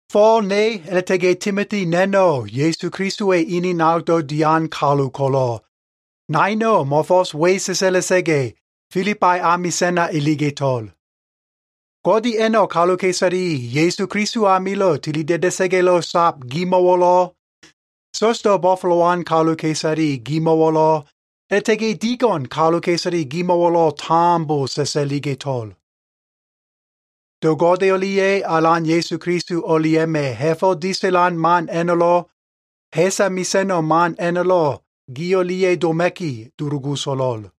Fo꞉l ne, a꞉la꞉ta꞉ga꞉ Timoti na꞉no꞉ Ya꞉su Kelisowa꞉ ene nanogdo꞉ dian kalu ko꞉lo꞉, naino꞉ mo꞉fo꞉s we sa꞉sa꞉la꞉sa꞉ga꞉, Filibai amisa꞉na iliga꞉to꞉l. Godeya꞉no꞉ kaluka꞉isale Ya꞉su Keliso amilo꞉ tilida꞉da꞉sa꞉ga꞉lo꞉ sab gimo꞉wo꞉lo꞉, sa꞉sdo꞉ bo꞉fo꞉lowan kaluka꞉isale gimo꞉wo꞉lo꞉, a꞉la꞉ta꞉ga꞉ digo꞉n kaluka꞉isale gimo꞉wo꞉lo꞉ tambo sa꞉sa꞉liga꞉to꞉l. Do Gode o꞉lia꞉ Alan Ya꞉su Keliso o꞉lia꞉ma꞉ ha꞉fo꞉ disa꞉lan man a꞉no꞉lo꞉, ha꞉sa mesa꞉no꞉ man a꞉no꞉lo꞉ gi o꞉lia꞉ doma꞉ki dulugu so꞉lo꞉l.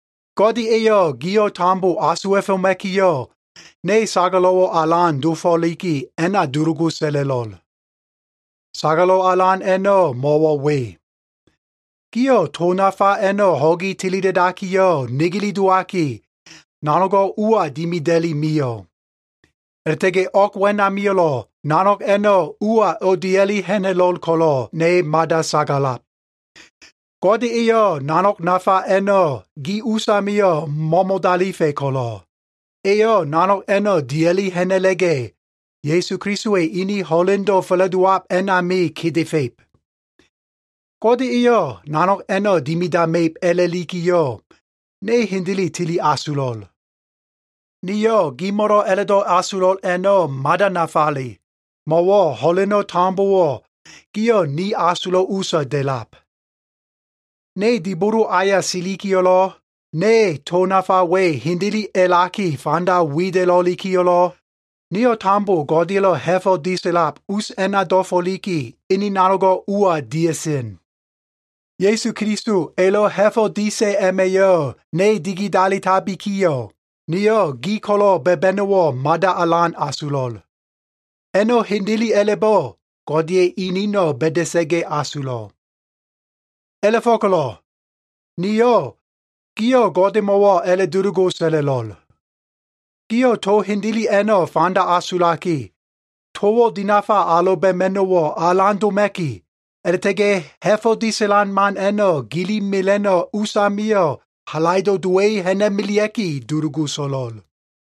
Gode eyo꞉ gio꞉ tambo asuwa꞉foma꞉kiyo꞉, ne sagalo꞉wo꞉ alan dofo꞉liki, a꞉na dulugu sa꞉la꞉lo꞉l. Sagalo꞉ alan a꞉no꞉ mo꞉wo꞉ we. Gio꞉ to nafa a꞉no꞉ ho꞉gi tilida꞉dakiyo꞉ negele dowaki, nanogo꞉ ua dimida꞉li mio꞉. A꞉la꞉ta꞉ga꞉ o꞉g wenamio꞉lo꞉ nanog a꞉no꞉ ua o꞉dia꞉li ha꞉na꞉lo꞉l ko꞉lo꞉, ne mada sagalab. Gode eyo꞉ nanog nafa a꞉no꞉ gi usamio꞉ mo꞉mo꞉dalifa꞉ ko꞉lo꞉, eyo꞉ nanog a꞉no꞉ dia꞉li ha꞉na꞉la꞉ga꞉, Ya꞉su Kelisowa꞉ ene ho꞉lendo꞉ fa꞉la꞉dowab a꞉nami kedefa꞉ib. Gode eyo꞉ nanog a꞉no꞉ dimidama꞉ib a꞉la꞉likiyo꞉, ne hendele tili asulo꞉l. Niyo꞉ gimo꞉lo꞉ a꞉la꞉do꞉ asulo꞉l a꞉no꞉ mada nafale, mo꞉wo꞉ ho꞉leno꞉ tambowo꞉ gio꞉ ni asulo꞉ usa da꞉lab. Ne dibolo aya silikiyo꞉lo꞉, ne to nafa we hendele a꞉laki fanda wida꞉lo꞉likiyo꞉lo꞉, nio꞉ tambo Godeya꞉lo꞉ ha꞉fo꞉ disa꞉lab us a꞉na dofo꞉liki, ene nanogo꞉ ua dia꞉sen. Ya꞉su Keliso elo꞉ ha꞉fo꞉ disa꞉ a꞉ma꞉yo꞉ ne digidalitabikiyo꞉, niyo꞉ gi ko꞉lo꞉ ba꞉ba꞉no꞉wo꞉ mada alan asulo꞉l. A꞉no꞉ hendele a꞉la꞉bo꞉ Godeya꞉ eneno꞉ ba꞉da꞉sa꞉ga꞉ asulo꞉. A꞉la꞉fo꞉ko꞉lo꞉ niyo꞉ gio꞉ Godemo꞉wo꞉ a꞉la꞉dulugu sa꞉la꞉lo꞉l. Gio꞉ to hendele a꞉no꞉ fanda asulaki, towo꞉ dinafa aloba꞉ma꞉no꞉wo꞉ alan doma꞉ki, a꞉la꞉ta꞉ga꞉ ha꞉fo꞉ disa꞉lan man a꞉no꞉ gili mela꞉no꞉ usamio꞉ halaido꞉ dowa꞉i ha꞉na꞉melea꞉ki, dulugu so꞉lo꞉l.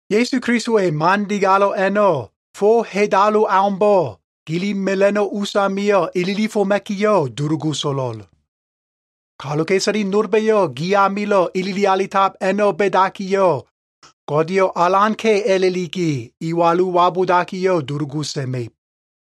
Ya꞉su Kelisowa꞉ man digalo꞉ a꞉no꞉, fo hedalu aumbo꞉ gili mela꞉no꞉ usamio꞉ ililifoma꞉kiyo꞉, dulugu so꞉lo꞉l. Kaluka꞉isale nolba꞉yo꞉ gi amilo꞉ ilili alitab a꞉no꞉ ba꞉dakiyo꞉, Godeyo꞉ alanka꞉ a꞉la꞉liki iwalu wabudakiyo꞉ dulugu sa꞉ma꞉ib.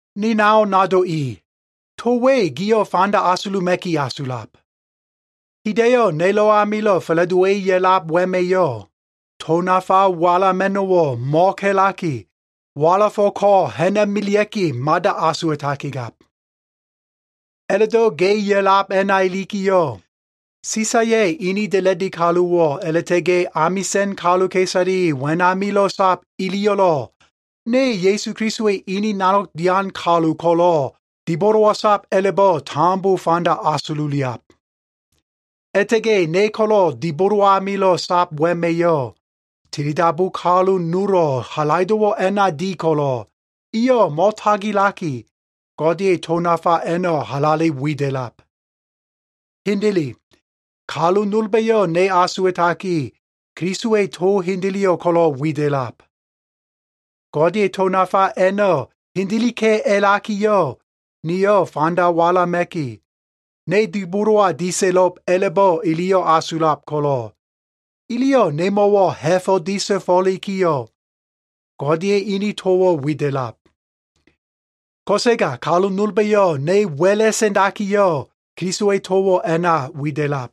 Ni nao nado i, to we gio꞉ fanda asuluma꞉ki asulab. Hida꞉yo꞉ nelo꞉ amilo꞉ fa꞉la꞉dowa꞉i ya꞉lab wema꞉yo꞉, to nafa walama꞉no꞉wo꞉ mo꞉ka꞉laki, walafo꞉ ko꞉ ha꞉na꞉melea꞉ki mada asuwa꞉takigab. A꞉la꞉do꞉ ga꞉iya꞉lab a꞉na ilikiyo꞉, Sisaya꞉ ene da꞉la꞉di kaluwo꞉ a꞉la꞉ta꞉ga꞉ amisa꞉n kaluka꞉isale wenamilo꞉ sab iliyo꞉lo꞉, ne Ya꞉su Kelisowa꞉ ene nanog dian kalu ko꞉lo꞉ dibolowa sab a꞉la꞉bo꞉ tambo fanda asululiab. A꞉la꞉ta꞉ga꞉ ne ko꞉lo꞉ dibolo amilo꞉ sab wema꞉yo꞉ tilidabu kalu nolo꞉ halaido꞉wo꞉ a꞉na di ko꞉lo꞉, iyo꞉ mo꞉tagilaki, Godeya꞉ to nafa a꞉no꞉ halale wida꞉lab. Hendele, kalu nolba꞉yo꞉ ne asuwa꞉takiyo꞉, Kelisowa꞉ to hendeleyo꞉ ko꞉lo꞉ wida꞉lab. Godeya꞉ to nafa a꞉no꞉ hendeleka꞉ a꞉lakiyo꞉ niyo꞉ fanda walama꞉ki, ne dibolowa disa꞉lo꞉b a꞉la꞉bo꞉ iliyo꞉ asulab ko꞉lo꞉, iliyo꞉ nemo꞉wo꞉ ha꞉fo꞉ disa꞉fo꞉likiyo꞉, Godeya꞉ ene towo꞉ wida꞉lab. Ko꞉sega kalu nolba꞉yo꞉ ne wa꞉la꞉ sa꞉ndakiyo꞉, Kelisowa꞉ towo꞉ a꞉na wida꞉lab.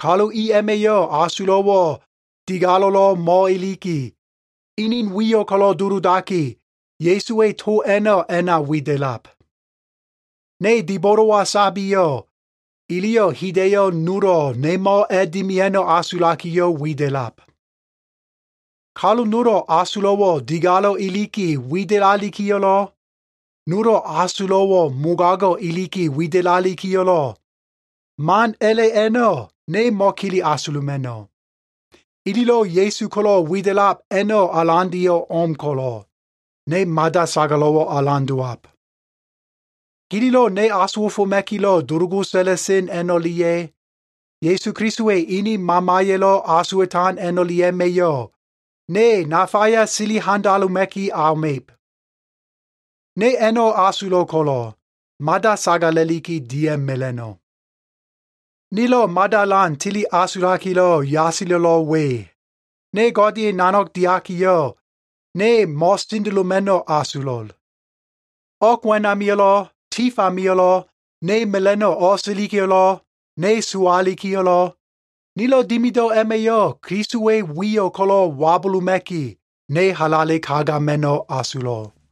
Kalu i a꞉ma꞉yo꞉ asulo꞉wo꞉ digalo꞉lo꞉ mo꞉iliki, inin wiyo꞉ ko꞉lo꞉ duludaki, Ya꞉suwa꞉ to a꞉no꞉ a꞉na wida꞉lab. Ne dibolowa sabiyo꞉, iliyo꞉ hida꞉yo꞉ nolo꞉ nemo꞉ a꞉dimia꞉no꞉ asulakiyo꞉ wida꞉lab. Kalu nolo꞉ asulo꞉wo꞉ digalo꞉ iliki widalikiyo꞉lo꞉, nolo꞉ asulo꞉wo꞉ mogago꞉ iliki widalikiyo꞉lo꞉, man a꞉la꞉ a꞉no꞉ ne mo꞉kele asuluma꞉no꞉. Ililo꞉ Ya꞉su ko꞉lo꞉ wida꞉lab a꞉no꞉ alandeyo꞉ o꞉m ko꞉lo꞉, ne mada sagalo꞉wo꞉ alan dowab. Gililo꞉ ne asuwa꞉foma꞉kilo꞉ dulugu sa꞉la꞉sen a꞉no꞉lia꞉, Ya꞉su Kelisowa꞉ ene Mamaya꞉lo꞉ asuwa꞉tan a꞉no꞉lia꞉ma꞉yo꞉, ne nafaya sili handaloma꞉ki auma꞉ib. Ne a꞉no꞉ asulo꞉ ko꞉lo꞉, mada sagala꞉liki dia꞉mela꞉no꞉. Nilo꞉ mada alan tili asulakilo꞉ yasilo꞉lo꞉ we. Ne Godeya꞉ nanog diakiyo꞉, ne mo꞉sendeloma꞉no꞉ asulo꞉l. O꞉g wenamio꞉lo꞉ tif amio꞉lo꞉, ne mela꞉no꞉ o꞉silikiyo꞉lo꞉, ne sowalikiyo꞉lo꞉, nilo꞉ dimido꞉ a꞉ma꞉yo꞉ Kelisowa꞉ wiyo꞉ ko꞉lo꞉ wabuluma꞉ki, ne halale kagama꞉no꞉ asulo꞉l.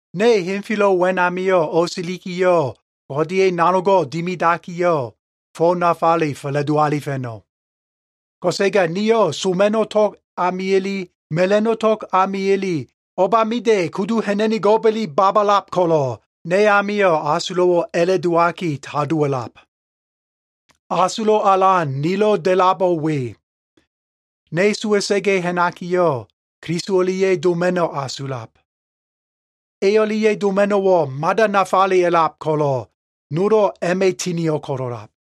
Ne henfelo꞉ wenamio꞉ o꞉silikiyo꞉, Godeya꞉ nanogo꞉ dimidakiyo꞉, fo nafale fa꞉la꞉do alifa꞉no꞉. Ko꞉sega niyo꞉ soma꞉no꞉ tog amiya꞉le, mela꞉no꞉ tog amiya꞉le, o꞉bamida꞉ kudu ha꞉na꞉nigo꞉ba꞉le babalab ko꞉lo꞉, ne amio꞉ asulo꞉wo꞉ a꞉la꞉ dowaki, tadowo꞉lab. Asulo꞉ alan nilo꞉ da꞉labo꞉ we. Ne sowa꞉sa꞉ga꞉ ha꞉nakiyo꞉, Keliso o꞉lia꞉ doma꞉no꞉ asulab. E o꞉lia꞉ doma꞉no꞉wo꞉ mada nafale a꞉lab ko꞉lo꞉, nolo꞉ a꞉ma꞉ tinio꞉ ko꞉lo꞉lab.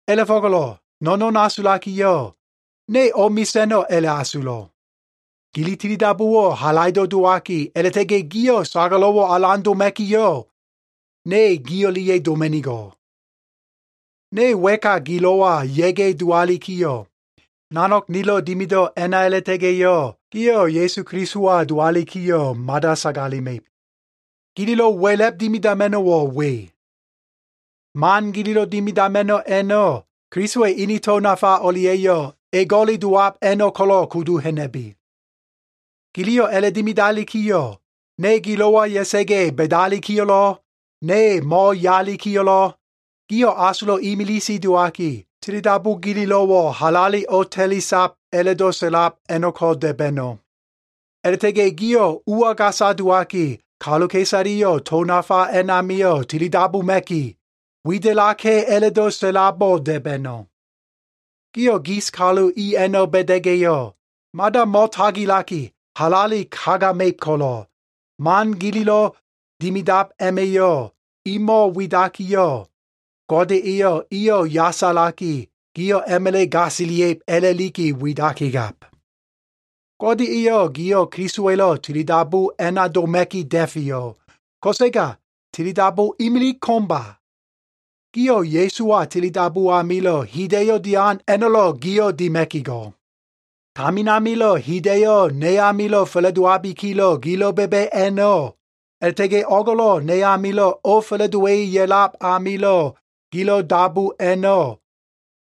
A꞉la꞉fo꞉ko꞉lo꞉ no꞉no꞉n asulakiyo꞉, ne o꞉mesa꞉no꞉ a꞉la꞉asulo꞉. Gili tilidabuwo꞉ halaido꞉ dowaki, a꞉la꞉ta꞉ga꞉ gio꞉ sagalo꞉wo꞉ alan doma꞉kiyo꞉, ne gi o꞉lia꞉ doma꞉nigo꞉l. Ne wa꞉ka gilo꞉wa ya꞉ga꞉ dowalikiyo꞉, nanog nilo꞉ dimido꞉ a꞉na a꞉la꞉ta꞉ga꞉yo꞉, gio꞉ Ya꞉su Kelisowa dowalikiyo꞉ mada sagalema꞉ib. Gililo꞉ wa꞉la꞉b dimidama꞉no꞉wo꞉ we. Man gililo꞉ dimidama꞉no꞉ a꞉no꞉, Kelisowa꞉ ene to nafa o꞉lia꞉yo꞉ ego꞉le dowab a꞉no꞉ ko꞉lo꞉ kudu ha꞉na꞉bi. Giliyo꞉ a꞉la꞉dimidalikiyo꞉, ne gilo꞉wa ya꞉sa꞉ga꞉ ba꞉dalikiyo꞉lo꞉, ne mo꞉yalikiyo꞉lo꞉, gio꞉ asulo꞉ imilise dowaki, tilidabu gililo꞉wo꞉ halale o꞉ta꞉lisab a꞉la꞉do꞉ sa꞉lab a꞉no꞉ko꞉ da꞉ba꞉no꞉. A꞉la꞉ta꞉ga꞉ gio꞉ ua gasa dowaki, kaluka꞉isaleyo꞉ to nafa a꞉namio꞉ tilidabuma꞉ki, wida꞉laka꞉ a꞉la꞉do꞉ sa꞉labo꞉ da꞉ba꞉no꞉. Gio꞉ gis kalu i a꞉no꞉ ba꞉da꞉ga꞉yo꞉, mada mo꞉tagilaki halale kagama꞉ib ko꞉lo꞉, man gililo꞉ dimidab a꞉ma꞉yo꞉ imo꞉ widakiyo꞉, Gode eyo꞉ iyo꞉ yasalaki, gio꞉ a꞉ma꞉la꞉ gasilia꞉ib a꞉la꞉liki widaki gab. Gode eyo꞉ gio꞉ Kelisowa꞉lo꞉ tilidabu a꞉na doma꞉ki da꞉feyo꞉, ko꞉sega tilidabu imilig ko꞉mba. Gio꞉ Ya꞉suwa tilidabu amilo꞉ hida꞉yo꞉ dian a꞉no꞉lo꞉ gio꞉ dima꞉ki go꞉. Tamin amilo꞉ hida꞉yo꞉ ne amilo꞉ fa꞉la꞉dowabikilo꞉ gilo꞉ ba꞉ba꞉ a꞉no꞉, a꞉la꞉ta꞉ga꞉ o꞉go꞉lo꞉ ne amilo꞉ o꞉fa꞉la꞉dowa꞉i ya꞉lab amilo꞉ gilo꞉ dabu a꞉no꞉,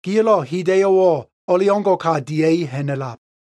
gio꞉lo꞉ hida꞉yo꞉wo꞉ o꞉leo꞉ngo꞉ka dia꞉i ha꞉na꞉lab.